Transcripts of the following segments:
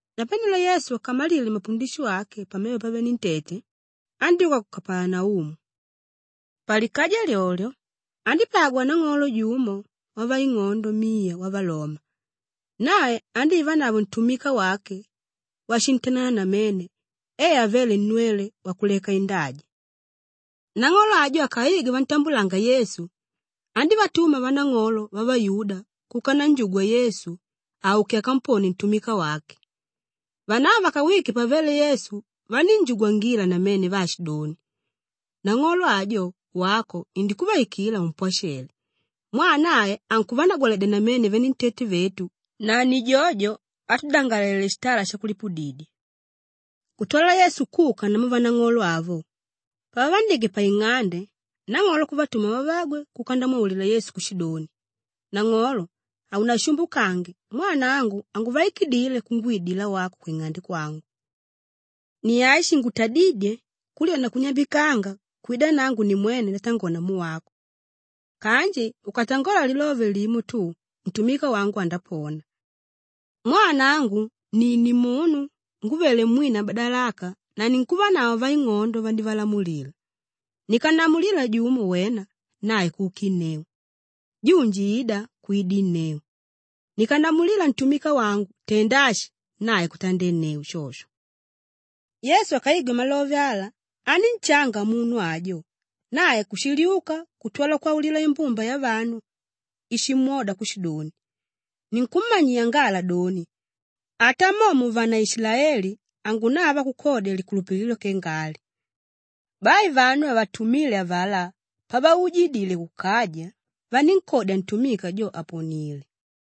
Napanelo Yesu akamalile mapundisho ake pamevo pavenentete, andyúka ku Kapalanaumu. Palikaja lyolyo, andípagwa nang'olo jumo wavaing'ondo miya wavaloma. Nae andívanavo ntumika wake washintanana namene e avéle nnwele wakuleka indaja. Nang'olo ajo akaigwe vantambulanga Yesu, andívatuma vanang'olo vavayuda kuka nanjugwa Yesu auke akamponie ntumika wake. Vanavo vakawike pavele Yesu vanínjugwangila namene vaashidoni, “Nang'olo ajo, wako indikuvaikila umpwashele mwaa nae ankuvanagwaledya namene venentete vetu na ni jojo átudangalele shitala shakulipudidya.” Kutwala Yesu kuka namu vanang'olo avo; pavavandike paing'ande, nang'olo kuvatuma vavagwe kuka ndamwaulila Yesu kushidoni, “Nang'olo, haunashumbukange mwaa nangu hanguvaikidile kungwidila wako kwing'ande kwangu. Ni ashi shingutadídye kulyona kunyambikanga kwida nangu nimwene ndatangola namu wako. Kanji ukatangola lilove limo tu, ntumika wangu andapona. Mwaa nangu ni nimunu ngúvele mwina madalaka na ninkuvanavo vaing'ondo vandivalamulila. Nikannamulila jumo, ‘Wena!’ Nae kukinneu. Junji, ‘Ida!’ Kwidinneu. Nikannamulila ntumika wangu, ‘Tenda ashi!’ Nae kutandenneu shosho.” Yesu akaigwe malove ala, anínshanga munu ajo; nae kushiliuka kutwala kwaulila imbumba yavanu íshimwoda kushidoni, “Ninkummanyiya ngala doni, ata mo muvanaishilaeli, hangunava kukodya likulupililo kenga ali.” Bai vanu vavatumíle avalá pavaujidile kukaja, vanínkodya ntumika jo àponile.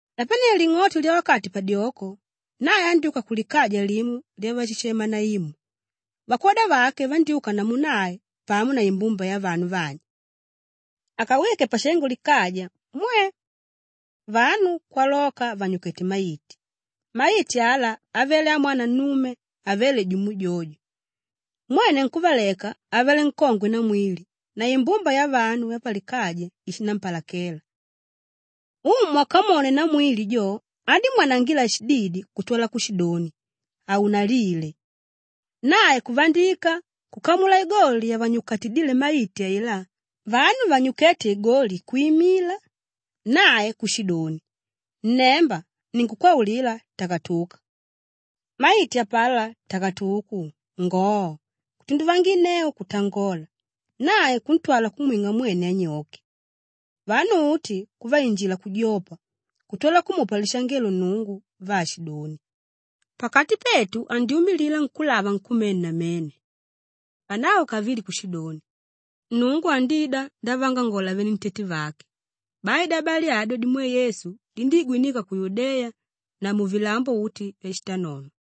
Napanelo ling'oto lyawakati padyoko, nae andyúka kulikaja limo lyavashema Naimu; vakwoda vake vandyúka namu nae pamo na imbumba yavanu vanji. Akawike pashengo likaja, mwe! Vanu kwaloka vànyukete maiti; maiti ala avele amwana nnume avéle jumo jojo. Mwene nkúvaleka avele nkongwe namwili na imbumba yavanu vapalikaja ishinampalakela. Umu akamwone namwili jo andímwanangila shididi kutwala kushidoni, “Haunalile.” Nae kuvandika, kukamula igoli yavanyukatidíle maiti ailá, vanu vanyukéte igoli kwimila nae kushidoni, “Nnemba! Ninkukwaulila, takatuka!” Maiti apalá takatuku, ngoo, kutunduvanginneu kutangola nae kuntwala kumwing'a mwene anyoke. Vanu uti kuvainjila kujopa kutwala kumupa lishangelo Nnungu vaashidoni, “Pakati petu andyumilila nkúlava nkumene namene!” Vanavo kavili kushidoni, “Nnungu andida ndavaangangola venentete vake!” Bai dyabali adyo dimwe Yesu dindíigwinika ku Yudeya na muvilambo uti vyashitanono.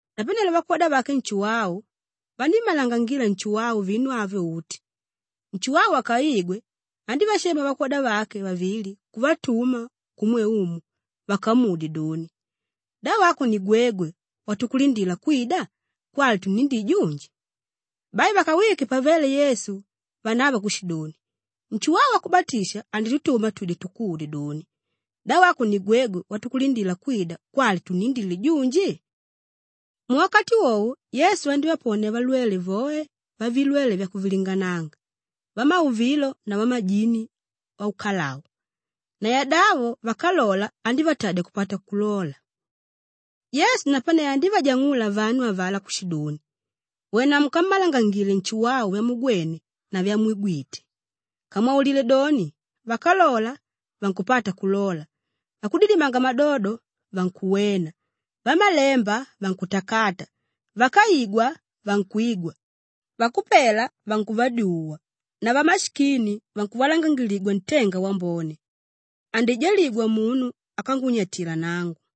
Napanelo vakwoda vake Nshuwau vanímmalangangila Nshuwau vinu avyo uti. Nshuwau akaigwe, andívashema vakwoda vake vavili kuvatuma kumwe Umu vakamudye doni, “Da wako ni gwegwe watukulindila kwida kwali tunnindile junji?” Bai vakawike pavele Yesu vanavo kushidoni, “Nshuwau Wakubatisha anditutuma twide tukudye doni, ‘Da wako ni gwegwe watukulindila kwida kwali tunnindile junji?’” Muwakati wowo Yesu andívaponia valwele voe vavilwele vyakuvilingananga, vamauvilo na vamajini aukalau. Na yadavo vákalola andívatadya kupata kulola. Yesu napane andívajang'ula vanu avalá kushidoni, “Wena mukammalangangile Nshuwau vyamugwene na vyamwigwite. Kamwaulile doni, vákalola vankupata kulola, vakudidimanga madodo vankuwena, vamalemba vankutakata, vákaigwa vankwigwa, vakupela vankuvadyuwa na vamashikini vankuvalangangiligwa ntenga wambone. Andijaligwa munu ákangunyatila nangu.”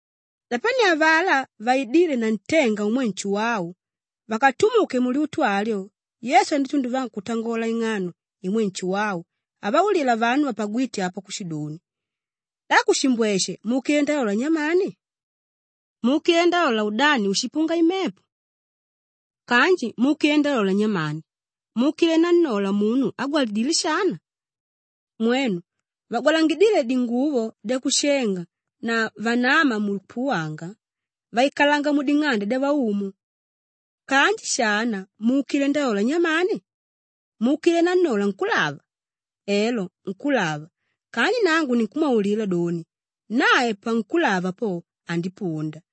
Napanelo avalá vaidíle na ntenga umwe Nshuwau vakatumuke mulyutu alyo Yesu andítunduvanga kutangola ing'ano imwe Nshuwau avaulila vanu vapagwíte apo kushidoni, “Da kushimbweshe muukile ndalola nyamani? Muukile ndalola udani úshipunga imepo? Kanji muukile ndalola nyamani? Muukile nannola munu ágwalangidile shana? Mwenu! Vagwalangidíle dinguvo dyakushenga na vanáma mukupuwanga, vaikalanga muding'ande dyavaumu. Kanji shana muukile ndalola nyamani? Muukile nannola nkúlava? Elo nkúlava kanji nangu ninkumwaulila doni, nae pankulava po, andipunda;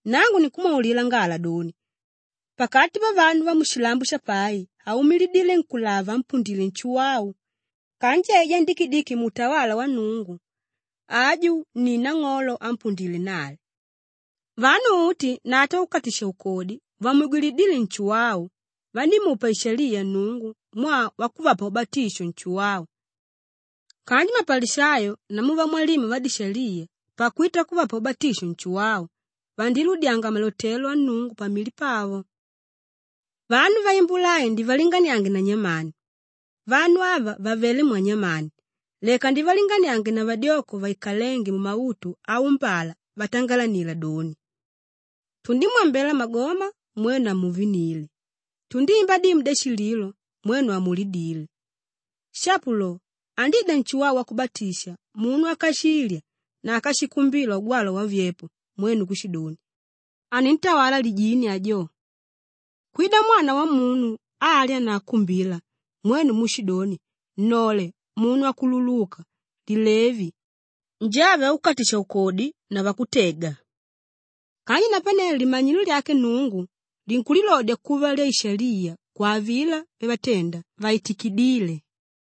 Nangu ninkumwaulila ngala doni, pakati pavanu vamushilambo shapai haumilidile nkúlava ámpundile Nshuwau. Kanji aijá ndikidiki muutawala wa Nnungu aju ni nang'olo ámpundile nae. Vanu uti na ata vakukatisha-ukodi vamwigwilidíle Nshuwau, vandímupa ishaliya Nnungu mwaa wakuvapa ubatisho Nshuwau kanji mapalishayo namu vamwalimu vadishaliya pakwita kuvapa ubatisho Nshuwau, vandiludyanga malotelo a Nnungu pamili pavo. “Vanu vaimbula ai ndivalinganiange na nyamani? Vanu ava vavele mwanyamani? Leka ndivalinganiange na vadyoko vaikalénge mumautu aumbala vatangalanila doni, “ ‘Tundimwambela magoma, mwenu hamuvinile. Tundimba dimu dyashililo, mwenu hamulidile.’ Shapo lo, andida Nshuwau Wakubatisha munu ákashilya na ákashikumbila ugwalwa wavyepo mwenu kushidoni, ‘Anintawala lijini ajo.’ Kwida Mwana Wamunu álya na ákumbila mwenu muushidoni, ‘Nnole munu wakululuka, lilevi, njave vakukatisha-ukodi na vakutega.’ Kanji napane limanyilo lyake Nnungu linkulilodya kuva lyaishaliya kwa avilá vyavatenda vaitikidíle.”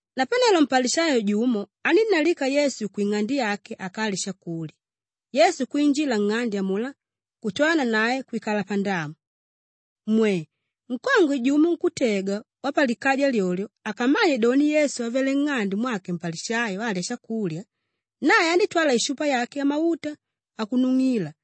Napanelo mpalishayo jumo anínnalika Yesu kwing'ande yake akalye shakulya; Yesu kwinjila nng'ande amulá kutwala nanae kwikala pandamu. Mwe! Nkongwe jumo nkútega wapalikaja lyolyo akamanye doni Yesu avelé nng'ande mwake mpalishayo alya shakulya, nae andítwala ishupa yake yamauta akunung'angila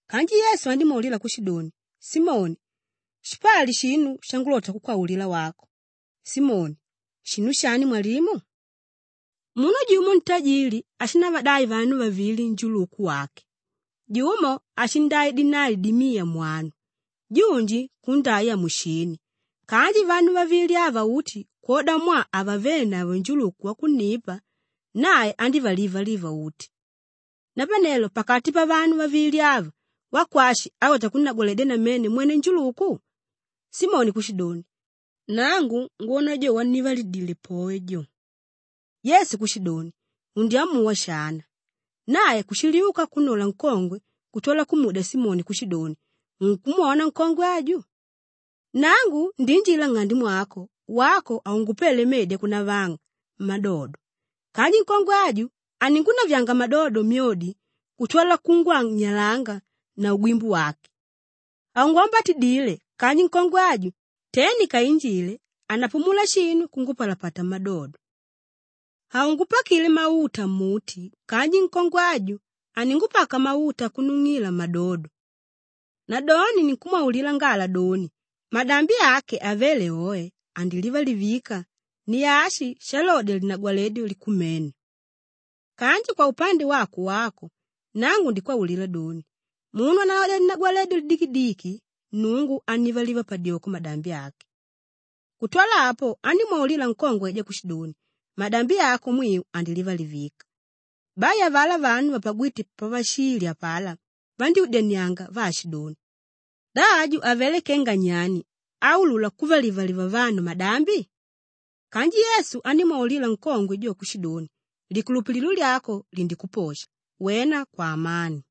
Kanji Yesu andímwaulila kushidoni, “Simoni! Shipali shinu shangulota kukwaulila wako.” Simoni, “Shinu shani mwalimu?” “Munu jumo ntajili ashindavadai vanu vavili njuluku wake. Jumo ashindai dinali dimiya mwanu, junji kundai amushini. Kanji vanu vavili ava uti kwodamwaa havavenavo njuluku wakunnipa, nae andívalivalivila uti. Napanelo pakati pavanu vavili ava, wakwashi álota kunnagwaledya namene mwene njuluku?” Simoni kushidoni, “Nangu ngwona jo wannivalidile poe jo.” Yesu kushidoni, “Undyamuwa shana.” Nae kushiliuka kunnola nkongwe kutwala kumudya Simoni kushidoni, “Unkumwona nkongwe aju? Nangu ndiinjila nng'ande mwako, wako haungupele medi akunavanga mmadodo kanji nkongwe aju, aningunavyanga madodo myodi kutwala kungwanyalanga na ugwimbu wake. Haungukumbatidile kanji nkongwe aju, te ndikainjile hanapumula shinu kungupalapata mmadodo. Haungupakile mauta mmuti kanji nkongwe aju, aningupaka mauta akunung'ila mmadodo. Nadoni ninkukwaulila ngala doni, madambi ake avéle oe, andilivalivika; ni ashi shalodya linagwaledyo likumene. Kanji kwaupande wako wako, nangu nikwaulila doni, munu ánalodya linagwaledyo lidikidiki, Nnungu annivaliva padyoko madambi ake.” Kutwala apo andímwaulila nkongwe aijá kushidoni, “Madambi ako mwiu andilivalivika.” Bai avalá vanu vapagwíte pavashilya apalá vandyúdyanianga vaashidoni, “Da aju avelé kenga nyani áulula kuvalivaliva vanu madambi?” Kanji Yesu andímwaulila nkongwe jo kushidoni, “Likulupililo lyako lindikuposha, wena kwaamani.”